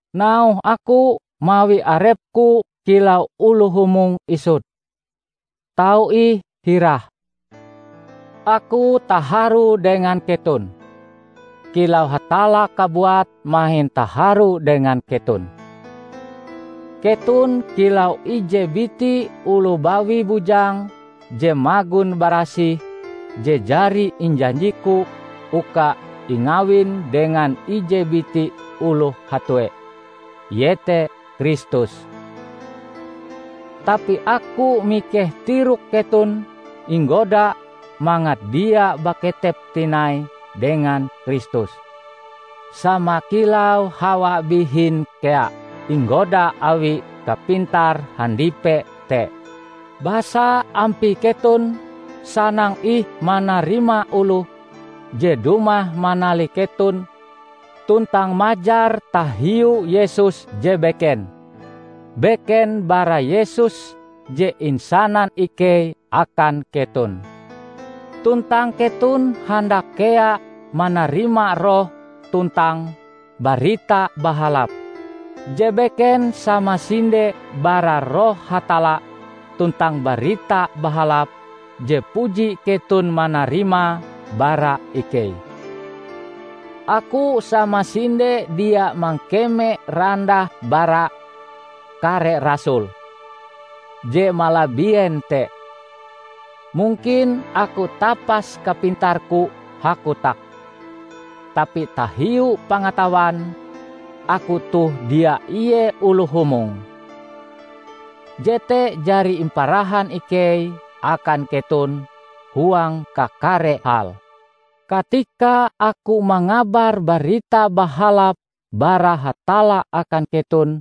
Nauhe aku mawi arepku kilau oloh humong isut. Tau ih hirahe? Aku taharu dengan keton, kilau Hatalla kabuat mahin taharu dengan keton. Keton kilau ije biti oloh bawi bujang je magon barasih je jari injanjiku uka ingawin dengan ije biti oloh hatue, iete Kristus. Tapi aku mikeh tirok keton inggoda mangat dia baketep tinai dengan Kristus, sama kilau Hawa bihin kea inggoda awi kapintar handipe te. Basa ampie keton sanang ih manarima oloh je dumah manalih keton tuntang majar tahiu Yesus je beken -- beken bara Yesus je insanan ikei akan keton. Tuntang keton handak kea manarima roh tuntang "Barita Bahalap" je beken samasinde bara Roh Hatalla tuntang Barita Bahalap je puji keton manarimae bara ikei. Aku samasinde dia mangkeme randah bara "kare rasul" je malabien te! Mungkin aku tapas kapintarku hakotak, tapi tahiu pangatawan, aku toh dia ie oloh humong. Jete jari imparahan ikei akan keton huang kakare hal. Katika aku mangabar Barita Bahalap bara Hatalla akan keton,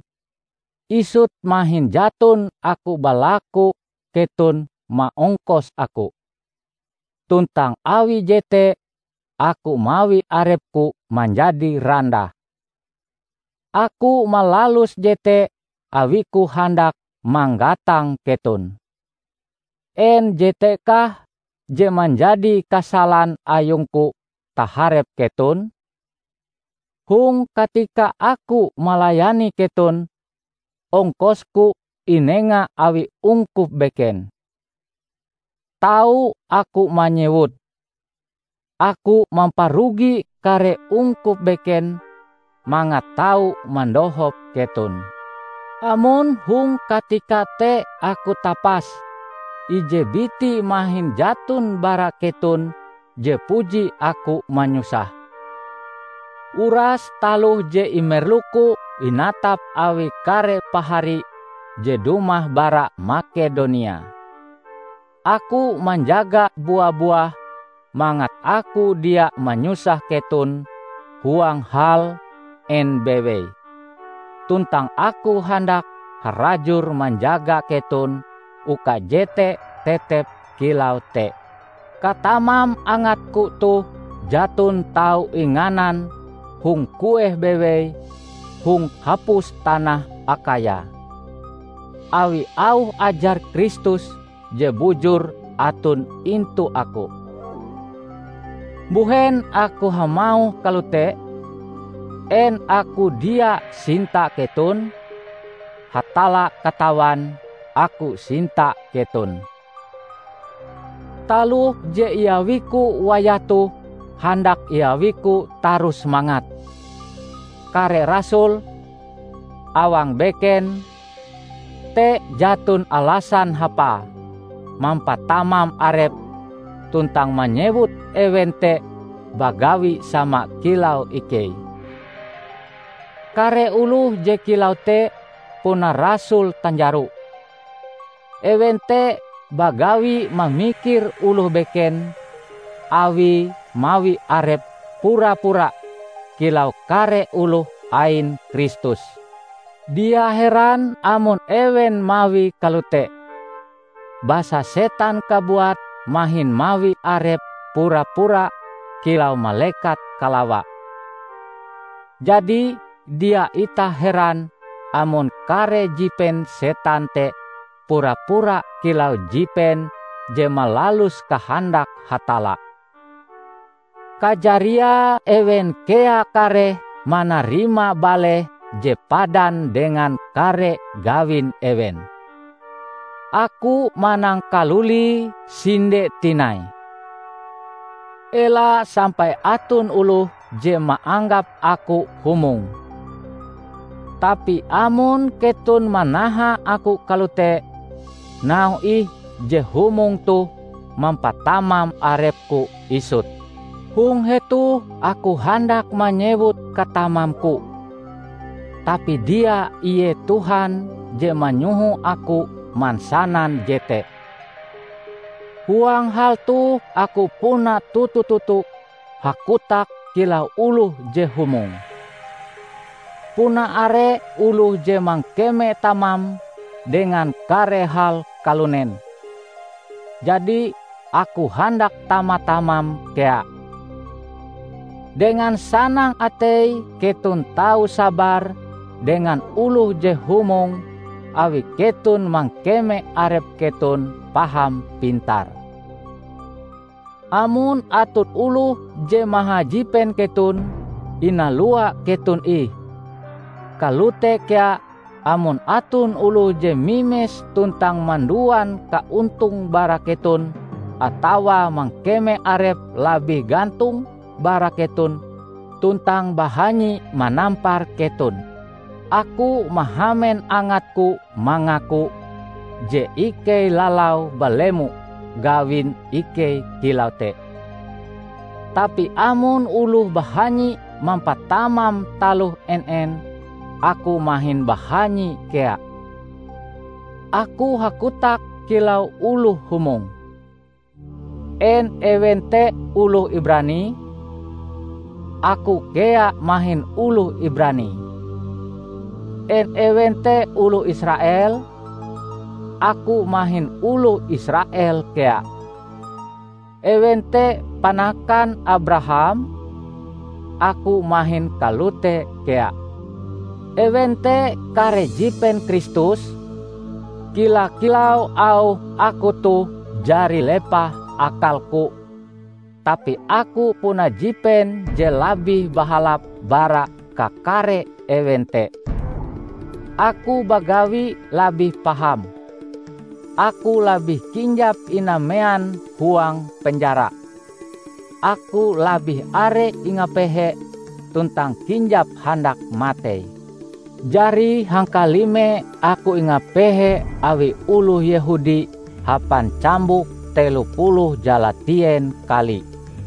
isut mahin jaton aku balaku keton maongkos aku; tuntang awi jete aku mawi arepku manjadi randah. Aku malalus jete awiku handak manggatang keton. En jetekah je manjadi kasalan ayungku taharep keton? Hong katika aku melayani keton, ongkosku inenga awi ungkup beken. Tau aku manyewute, aku mamparugi kare ungkup beken mangat tau mandohop keton. Amon hong katika te aku tapas, ije biti mahin jaton bara keton je puji aku manyusahe. Uras taloh je imerluku inatap awi kare pahari je dumah bara Makedonia. Aku manjaga bua-buah mangat aku dia manyusah keton huang hal en bewei, tuntang aku handak harajur manjaga keton uka jete tetep kilau te. Katamam angatku toh jaton tau inganan hong kueh bewei hong hapus tanah Akhaya, awi auh ajar Kristus je bujur aton intu aku. Mbuhen aku hamauh kalote? En aku dia sinta keton? Hatalla katawan aku sinta keton! Taloh je iawiku wayah toh handak iawiku tarus mangat "kare rasul" awang beken te jaton alasan hapae mampatamam arepe tuntang manyewut ewen te bagawi sama kilau ikei. Kare oloh je kilau te puna rasul tanjaro. Ewen te bagawi mamikir oloh beken awie mawi arepe pura-pura kilau kare oloh ain Kristus. Dia heran amon ewen mawie kalote, basa setan kabuat mahin mawi arepe pura-pura kilau malekat kalawa! Jadi, dia itah heran amon kare jipen setan te pura-pura kilau jipen je malalus kahandak Hatalla. Kajariae ewen kea kareh manarima baleh je padan dengan kare gawin ewen. Aku manangkalulie sinde tinai: Ela sampai aton oloh je maanggap aku humong. Tapi amon keton manaha aku kalote, nauhe ih je humong toh mampatamam arepku isut. Hong hetoh aku handak manyewut katamamku, tapi dia ie Tuhan je manyoho aku mansanan jete. Huang hal toh aku puna toto-toto hakotak kilau oloh je humong. Puna are oloh je mangkeme tamam dengan kare hal kalunen, jadi aku handak tama-tamam kea. Dengan sanang atei keton tau sabar dengan oloh je humong awi keton mangkeme arep keton paham pintar! Amon aton oloh je mahajipen keton, inalua keton ih; kalote kea amon aton oloh je mimes tuntang manduan kaontong bara keton, atawa mangkeme arepe labih gantong bara keton tuntang bahanyi manampar keton. Aku mahamen angatku mangaku je ikei lalau balemo gawin ikei kilau te. Tapi amon oloh bahanyi mampatamam taloh en-en, aku mahin bahanyi kea! (Aku hakotak kilau oloh humong.) En ewen te oloh Ibrani? Aku kea mahin oloh Ibrani. En ewen te oloh Israel? Aku mahin oloh Israel kea. Ewen te panakan Abraham? Aku mahin kalote kea! Ewen te kare jipen Kristus? Kila-kilau auhe aku toh jari lepah akalku, tapi aku puna jipen je labih bahalap bara kakare ewen te! Aku bagawi labih paham, aku labih kinjap inamean huang penjara, aku labih are ingapehe tuntang kinjap handak matei. Jari hangkalime aku ingapehe awi oloh Yehudi hapan cambuk telo puluh jalatien kali.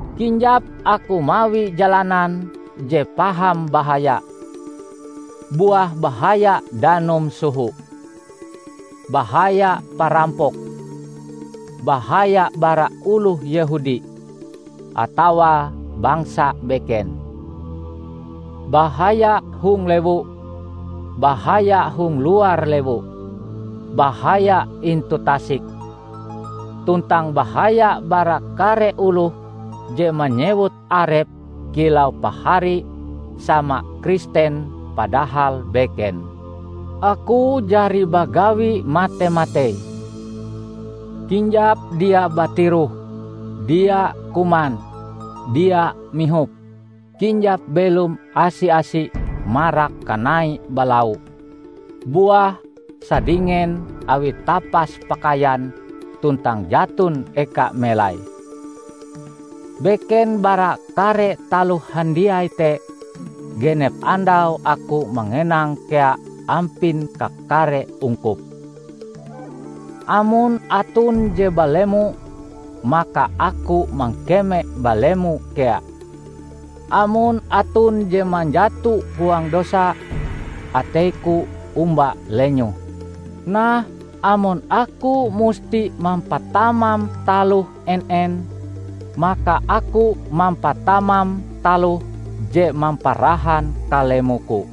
Kinjap aku mawi jalanan je paham bahaya; buah bahaya danum soho; bahaya parampok, bahaya bara oloh Yehudi atawa bangsa beken, bahaya hong lewu, bahaya hong luar lewu, bahaya intu tasik, tuntang bahaya bara kare oloh je manyewut arepe kilau pahari sama Kristen padahal beken. Aku jari bagawi mate-matei: kinjap dia batiroh, dia kuman, dia mihop, kinjap belom asi-asi marak kanai' balau', buah sadingen awi tapas pakaian tuntang jaton eka melai. Beken bara kare taloh handiai te, genep andau aku mangenang kea ampin kakare ungkup. Amon aton je balemo maka aku mangkeme balemo kea. Amon aton je manjato huang dosa, ateiku omba lenyoh. Nah, amon aku musti mampatamam taloh en-en, maka aku mampatamam taloh je mamparahan kalemoku.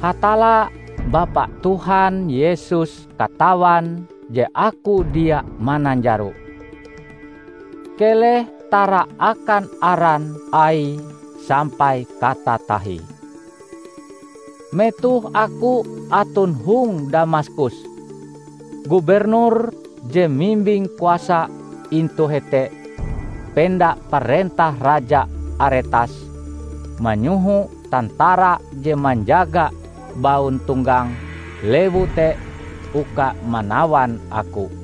Hatalla, Bapa Tuhan Yesus katawan je aku dia mananjaro. Keleh tara akan aran Aie sampai katatahie. Metoh aku aton hong Damaskus, gubernur je mimbing kuasa intu hete penda parentah raja Aretas, manyoho tantara je manjaga bauntonggang lewu te uka manawan aku.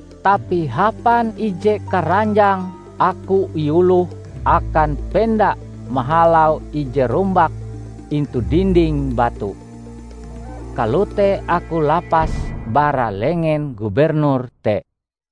Tapi hapan ije karanjang aku iuloh akan penda mahalau ije rumbak intu dinding batu. Kalote aku lapas bara lengen gubernur te.